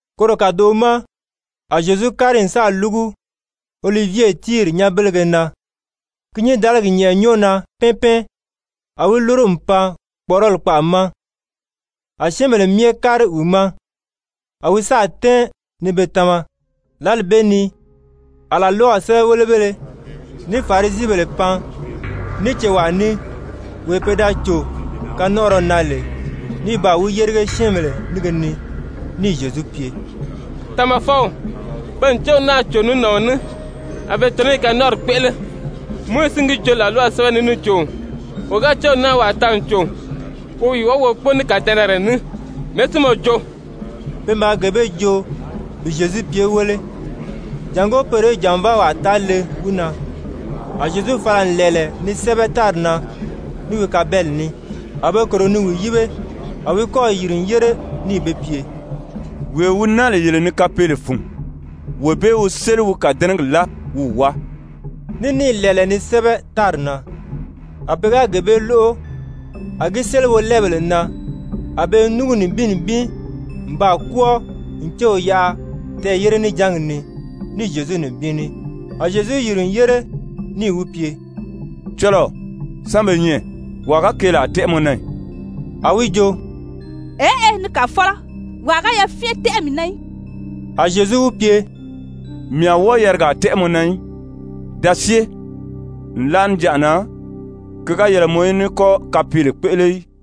Koro kàdoʔo ma a Zyezu kári n sáà lúgu Olivye tíiri nyanbelege na. Ki nyǐndaligi nyɛ̀ʔɛ nyɔ́ɔ na pɛ́ɛn pɛ́ɛn, a wi lúru n pan kpɔ̀ʔɔrɔli kpaʔa ma. A syɛ́ɛnbèle myɛ kári wi ma, a wi sáà tɛ́ɛn ni be tama. Lǎli bee ni a làlwaw sɛ́bɛwelebéle ní Farisibèle pan ní cewaa ní, wee pe da cò kanɔnʔɔrɔ na lè ní baa wi yérige syɛ́ɛnbèle nínge ni, níì Zyezu pye: «Tamafɔw, pe n céw naa cò ní nàɔn ní, a be tɔ̀nɔ́ i kanɔnʔɔri kpéʔele. Mowizi si n gi joo làlwaw sɛ́bɛ ni níì jo, wo ga céw naa wàa taa n cò, wo wi wábagi wo kpóo ní kàdɛnɛrɛ ní. Mɛ̀ɛ́ si mɔ jo?» Pe maa gee bee joo bi Zyezu pye wéle, jàngó poro í jànvaawaa taa le wi na. A Zyezu fala n lɛ̀ɛlɛ ni sɛ́bɛ tári na ní wi kabeli ní. A be kòro ni wi yíbe. A wi kɔ́ɔ̀ yìri n yére níì be pye: «Wee wi naa lè yele ni kapeele fun, wee bee wi séli wi kàdɛnɛgi láa wi wi wáa.» Ní níì lɛ̀ɛlɛ ni sɛ́bɛ tári na. A pe ga gee bee lóʔo, a gi séli wolɛɛbèle na, a be i núngu nibin nibin n baa kwɔ́ɔ n céw yaʔa tɛɛ̀yére-níjangi ni ní Zyezu nibin ní. A Zyezu yìri n yére, níì wi pye: «Cɔlɔɔ, sán be nyɛ? Wàa ga keelaa tɛ́ʔɛ mɔ na ì?» A wi jo: «Eʔe, ni Kàfɔlɔ. Wàa ga yafyɛn tɛ́ʔɛ mii na í.» A Zyezu wi pye: «Mii a wɔ́ɔ yarigaa tɛ́ʔɛ mɔ na í. Da syée. Nlaʔa níjanʔa na, ki ga yɛlɛ mɔ í ní kɔ́ kapeele kpéʔele í.»]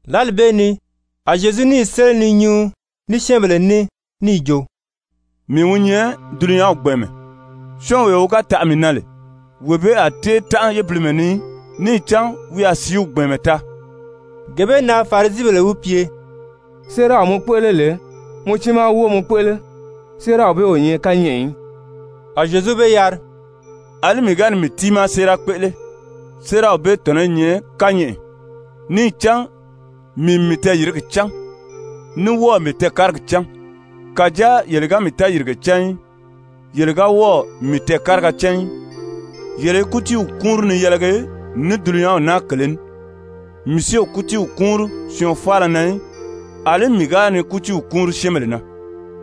Lǎli bee ni a Zyezu níì séli ni nyuu ní syɛ́ɛnbèle ní níì jo: «Mii wi nyɛ dulunyanw gbɛ̀ɛnmɛ. Syɔ́ɔnwee wi ga taʔa mii na lè, wee bee a tée tánʔa yébilimɛ ni í, níì cán wi a sìíw gbɛ̀ɛnmɛ taa.» Gee bee na Farisibèle wi pye: «Séeraw mɔ kpéʔele lè, mɔ tiimaa wóo mɔ kpéʔele, séeraw bee o nyɛ kányɛʔɛ í.» A Zyezu be yari: «Alí mii ga ni mii tiimaa séera kpéʔele, séeraw bee tɔ̀nɔ́ i nyɛ kányɛʔɛ, níì cán mii n mii tɛɛyìrigi cán ní wɔ́ɔ̀ mii tɛɛkárigi cán. Kàjáa yele ga mii tɛɛyìrige cán í, yele ga wɔ́ɔ̀ mii tɛɛkáriga cán í. Yele i kútiiw kúunri ni yɛlɛgi ní dulunyanw naa kèlē ní. Mii si o kútii kúunri syɔɔn faala na í. Alí mii ga ni kútiiw kúunri syɛ́ɛnbèle na,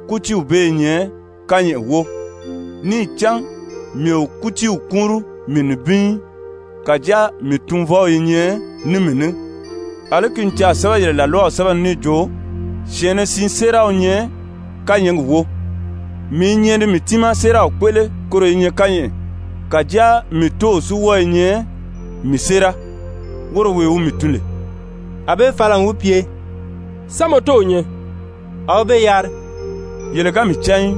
kútiiw bee i nyɛ kányɛʔɛ wóo, níì cán mii o kútiiw kúunri mii nibin í, kàjáa mii Tunvɔw i nyɛ ní mii ní. Alí ki n caà sɛ́bɛ yele làlwaw sɛ́bɛ ni níì jo: ‹Syɛ̀ɛnnɛ siin séera wi nyɛ kányɛɛgi wóo.› Mii i nyɛ ni mii tiimaa séeraw kpéʔele koro i nyɛ kányɛʔɛ, kàjáa mii Tóow si wɔ́ɔ i nyɛ mii séera, woro wee wi mii tun lè.» A be fala n wi pye: «Sán mɔ tóow nyɛ?» A wi be yari: «Yele ga mii cán í,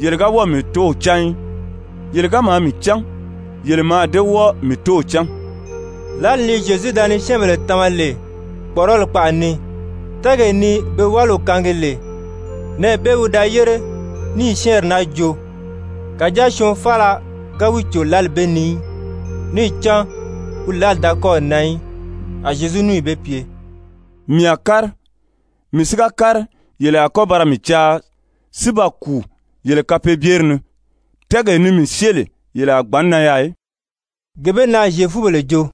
yele ga wɔ́ɔ̀ mii Tóow cán í. Yele ga maa mii cán, yele mǎà dée wɔ́ɔ mii Tóow cán.» Lǎli ni Zyezu da ni syɛ́ɛnbèle tama lè kpɔ̀ʔɔrɔli kpaʔa ni, tɛ́ɛgee ni be wáliw kaangi lè, nɛɛ bee wi da yére níì syɛ́ɛnri naa joo. Kàjáa syɔɔn faala ga wi cò lǎli bee ni í, níì cán wi lǎli da kɔ́ɔ̀ nan í. A Zyezu níì be pye: «Mii a kári, mii si ga kári, yele a kɔ́ ba ra mii caa si ba kùu yele kapeebyeri ni. Tɛ́ɛgee ni mii syée lè, yele a gbǎn nan yaà í.» Gee bee na Zyefubèle jo: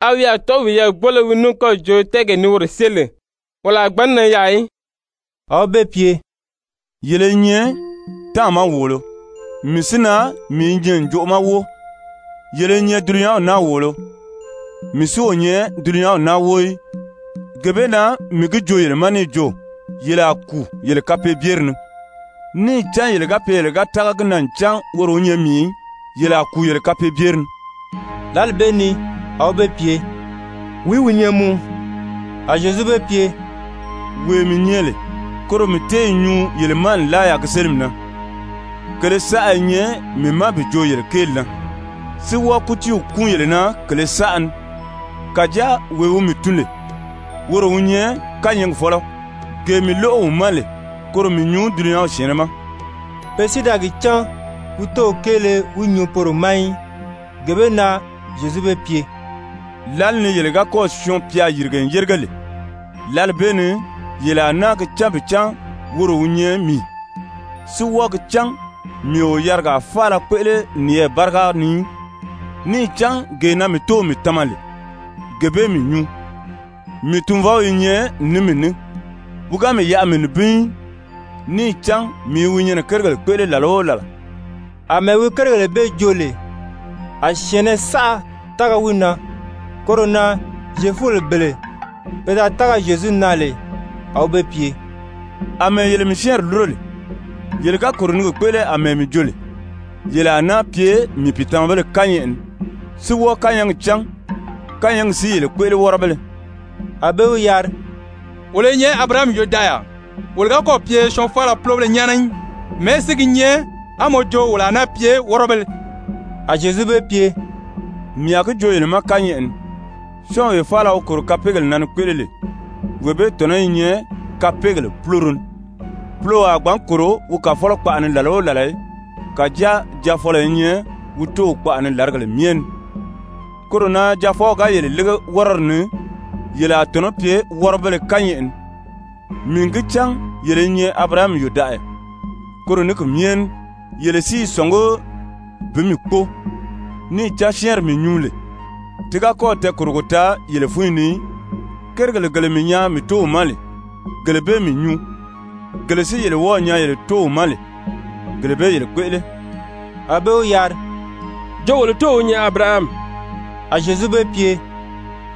«A wi a tɔ̀ʔɔ́ wiyɛɛ gbóo lé wii ní kɔ́ɔ̀ jo tɛ́ɛgee ni woro syée lè, wolo a gbǎn nan yaà í?» A wi be pye: «Yele i nyɛ táàma wòolo. Mii si na mii i nyɛ ǹjoʔo ma wóo. Yele i nyɛ dulunyanw naa wòolo, mii si o nyɛ dulunyanw naa wóo í. Gee bee na mii gi joo yele ma níì jo: Yele a kùu yele kapeebyeri ni. Níì cán yele ga pye yele ga tága gi na ncan woro wi nyɛ mii í, yele a kùu yele kapeebyeri ni.» Lǎli bee ni a be wi pye: «Wìí wi nyɛ mɔ?» A Zyezu be pye: «Wee mii nyɛ lè, koro mii téē nyuu yele ma nlaa yaà gi sélimi na. Kèlē saʔa i nyɛ mii ma bi joo yele kéeli na, si wɔ́ɔ kútiiw kúun yele na kèlē saʔa ni. Kàjáa wee wi mii tun lè woro wi nyɛ kányɛɛgi fɔ́lɔ, gee mii lóʔo wi ma lè koro mii nyuu dulunyanw syɛ̀ɛnnɛ ma.» Pe si da gi cán wi Tóow kéele wi nyuu poro ma í. Gee bee na Zyezu be pye: «Lǎli ni yele ga kɔ́ɔ̀ Syɔɔn-pya yìrige n yérige lè, lǎli bee ni yele a náa gi cán bi cán woro wi nyɛ mii, si wɔ́ɔ gi cán mii o yarigaa faala kpéʔele niyɛɛ báriga ni í. Níì cán gee na mii Tóow mii tama lè, gee bee mii nyuu. Mii Tunvɔw i nyɛ ní mii ní, wi ga mii yaʔa mii nibin í, níì cán mii i wi nyɛnɛ kérigèle kpéʔele làla o làla.» Amɛɛ wi kérigèle bee joo lè, a syɛ̀ɛnnɛ saʔa tága wi na. Koro na Zyefubèle bele pe da tága Zyezu na lè, a wi be pye: «Amɛɛ yele mii syɛ́ɛnri lúro lè, yele ga kòro ni gi kpéʔele àmɛɛ mii jo lè, yele a náa pye mii pìitamabéle kányɛʔɛ ni, si wɔ́ɔ kányɛɛgi cán, kányɛɛgi si yele kpéʔele wɔ́rɔbéle.» A be wi yari: «Wolo i nyɛ Abirahami yòdaʔaya, wolo ga kɔ́ɔ̀ pye syɔɔn faala púlobéle nyáana í. Mɛ̀ɛ́ si gi nyɛ á mɔ jo wolo a náa pye wɔ́rɔbéle?» A Zyezu be pye: «Mii a gi joo yele ma kányɛʔɛ ni, syɔ́ɔnwee faala wi kòro kapeegèle na ni kpéʔele lè, wee bee tɔ̀nɔ́ i nyɛ kapeegèle púloro ni. Puloo a gbǎn kòro wi kàfɔlɔ kpaʔa ni làla o làla í. Kàjáa jaafɔlɔ i nyɛ wi tóow kpaʔa ni làrigèle myɛ ni. Koro na Jaafɔw ga yele lége wɔ́rɔdi ni, yele a tɔ̀nɔ́ pye wɔ́rɔbéle kányɛʔɛ ni. Mii n gi cán yele i nyɛ Abirahami yòdaʔaya, koro ní ki myɛ ní yele si i sɔ̀ngí bi mii kpóo. Níì cán syɛ́ɛnri mii nyuu lè, ti ga kɔ́ɔ̀ tɛɛkòrogo taa yele fúnyi ni í. Kérigèle gele mii nyaa mii Tóow ma lè, gele bee mii nyuu. Gele si yele wɔ́ɔ̀ nyaa yele tóow ma lè, gele bee yele kpéʔele.» A be wi yari: «Jo wolo tóow wi nyɛ Abirahami.» A Zyezu be pye: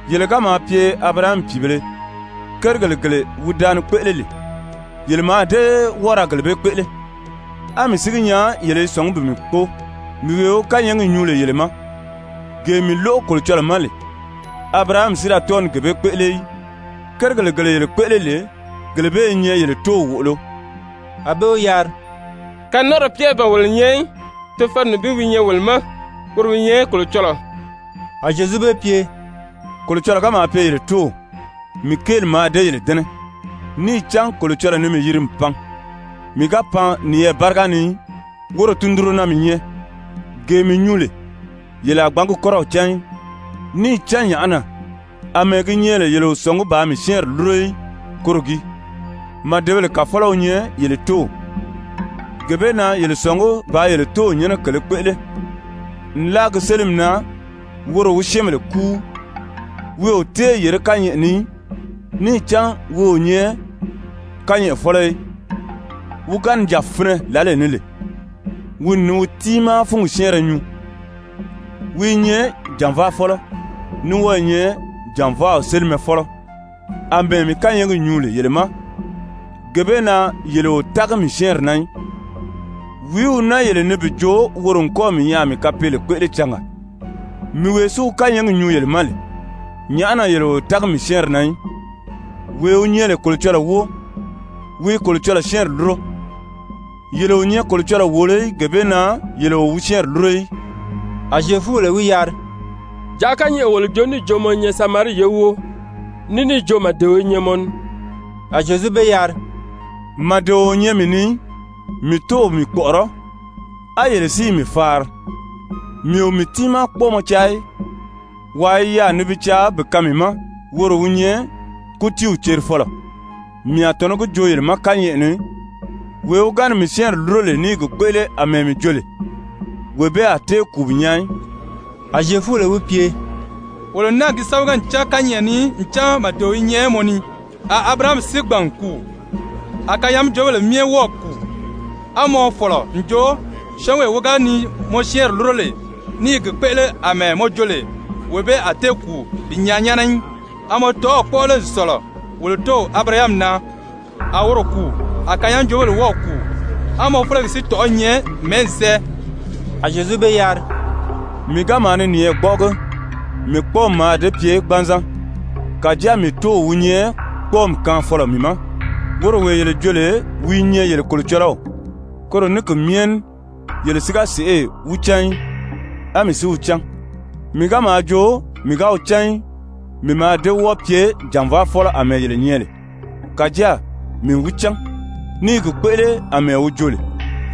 «Yele ga maa pye Abirahami pìibēle, kérigèle gele wi da ni kpéʔele lè, yele mǎà dée wɔ́ɔ ra gele bee kpéʔele. A mii si gi nyaa yele i sɔ̀ngí bi mii kpóo, mii wee wi kányɛɛgi nyuu lè yele ma, gee mii lóʔo Kolocɔlɔɔ ma lè. Abirahami si da tɔ́ɔ ni gee bee kpéʔele í. Kérigèle gele yele kpéʔele lè, gele bee i nyɛ yele tóow wòʔolo.» A be wi yari: «Kanɔnʔɔrɔ piibéle ban wolo nyɛ í. Tofɔlɔ nibin wi nyɛ wolo ma, woro wi nyɛ Kolocɔlɔɔ.» A Zyezu be pye: «Kolocɔlɔɔ ga maa pye yele Tóow, mii kéeli mǎà dée yele dɛ́nɛ, níì cán Kolocɔlɔɔ ni mii yiri n pan. Mii ga pan niyɛɛ báriga ni í, woro tundunro na mii nyɛ. Gee mii nyuu lè, yele a gbǎn gi kɔ́rɔw cán í. Níì cán nyàʔá na? Amɛɛ gi nyɛ lè yele o sɔ̀ngí bàā mii syɛ́ɛnri lúro í, koro gii. Màdebèle kàfɔlɔ wi nyɛ yele tóow, gee bee na yele sɔ̀ngí bàā yele tóow nyɛ́nɛ kèlē kpéʔele. Nlaa gi sélimi na woro wi syɛ́ɛnbèle kúu, wi o téē yèré kányɛʔɛ ni í, níì cán wi o nyɛ kányɛʔɛfɔlɔ í. Wi ga ni jà finɛ lǎlee ni lè, wi n ni wi tiimaa fúngi syɛ́ɛnrɛ nyuu. Wi i nyɛ jànvaafɔlɔ, ní wɔ́ɔ i nyɛ jànvaaw sélimafɔlɔ. Amɛɛ mii kányɛɛgi nyuu lè yele ma, gee bee na yele o tági mii syɛ́ɛnri na í! Wìí wi naa yele ni bi jo woro n kɔ́ɔ̀ mii nyaa a mii kapeele kpéʔele cangaa? Mii wee si wi kányɛɛgi nyuu yele ma lè, nyàʔá na yele o tági mii syɛ́ɛnri na í? Wee wi nyɛ lè Kolocɔlɔɔ wóo, wi i Kolocɔlɔɔ syɛ́ɛnri lúro. Yele o nyɛ Kolocɔlɔɔ wòolo í, gee bee na yele o wi syɛ́ɛnri lúro í.» A Zyefubèle wi yari: «Jàʔá kányɛʔɛ wolo joo níì jo mɔ i nyɛ Samarii ye wóo, ní níì jo màdeo i nyɛ mɔ ni.» A Zyezu be yari: «Màdeo o nyɛ mii ni í, mii Tóow mii kpɔ̀ʔɔrɔ́, á yele si i mii faari. Mii o mii tiimaa kpɔ́ɔmɔ caa í. Wàa i yaà ni bi caa bi kaan mii ma, woro wi nyɛ kútiiw cerifɔlɔ. Mii a tɔ̀nɔ́ gi joo yele ma kányɛʔɛ ni, wee wi ga ni mii syɛ́ɛnri lúro lè ní i gi kpéʔele àmɛɛ mii jo lè, wee bee a tée kùu bi nyaa í.» A Zyefubèle wi pye: «Wolo n náà gi sámaga n cán kányɛʔɛ ni ncan màdeo i nyɛ mɔ ni. A Abirahami si gbàn n kùu, a kanyaajoobèle myɛ wɔ́ɔ̀ kùu, á mɔ fɔ̀lɔ n jo syɔ́ɔnwee wi ga ni mɔ syɛ́ɛnri lúro lè ní i gi kpéʔele àmɛɛ mɔ jo lè, wee bee a tée kùu bi nyaa nyáana í. A mɔ tɔ̀ʔɔ̂ kpɔ́ʔɔ lé n sɔ̀lɔ wolo tóow Abirahami na? A woro kùu, a kanyaajoobèle wɔ́ɔ̀ kùu. A mɔ félegi si tɔ̀ʔɔ́ i nyɛ mɛ̀ɛ́ n sɛ́ɛ?» A Zyezu be yari: «Mii ga maa ni niyɛɛ gbɔ́ʔɔgi, mii kpɔ́ɔmi mǎà dée pye gbanzan. Kàjáa mii Tóow wi nyɛ kpɔ́ɔmi kaanfɔlɔ mii ma, woro wee yele jo lè wi i nyɛ yele Kolocɔlɔw. Koro ní ki myɛ ní yele si ga sèʔê wi cán í, á mii si wi cán. Mii ga maa jo mii ga wi cán í, mii mǎà dée wɔ́ɔ pye jànvaafɔlɔ àmɛɛ yele nyɛ lè. Kàjáa mii n wi cán, ní i gi kpéʔele àmɛɛ wi jo lè.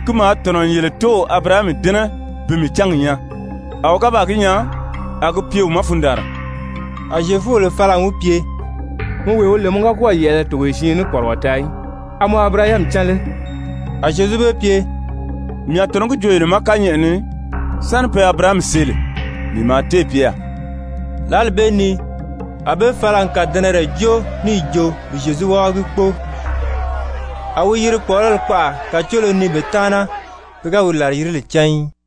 Ki maa tɔ̀nɔ n yele tóow Abirahami dɛ́nɛ bi mii cángi nyaa, a wi ga baa gi nyaa, a gi pye wi ma fundaanra.» A Zyefubèle fala n wi pye: «Mɔ wee wi lè mɔ ga kɔ́ɔ̀ yɛ̀ʔɛlɛ togoye siin ní kpɔrigɔ taa í, a mɔ Abirahami cán lé?» A Zyezu be pye: «Mii a tɔ̀nɔ́ gi joo yele ma kányɛʔɛ ni, sáni pe Abirahami see lè, mii maa téè pye yaà.» Lǎli bee ni a be fala n kàdɛnɛrɛ jóo níì jo bi Zyezu wábagi kpóo. A wi yiri kpɔ̀ʔɔrɔli kpaʔa kàcoolo ni be taana, pe ga wi làriyirile cán í.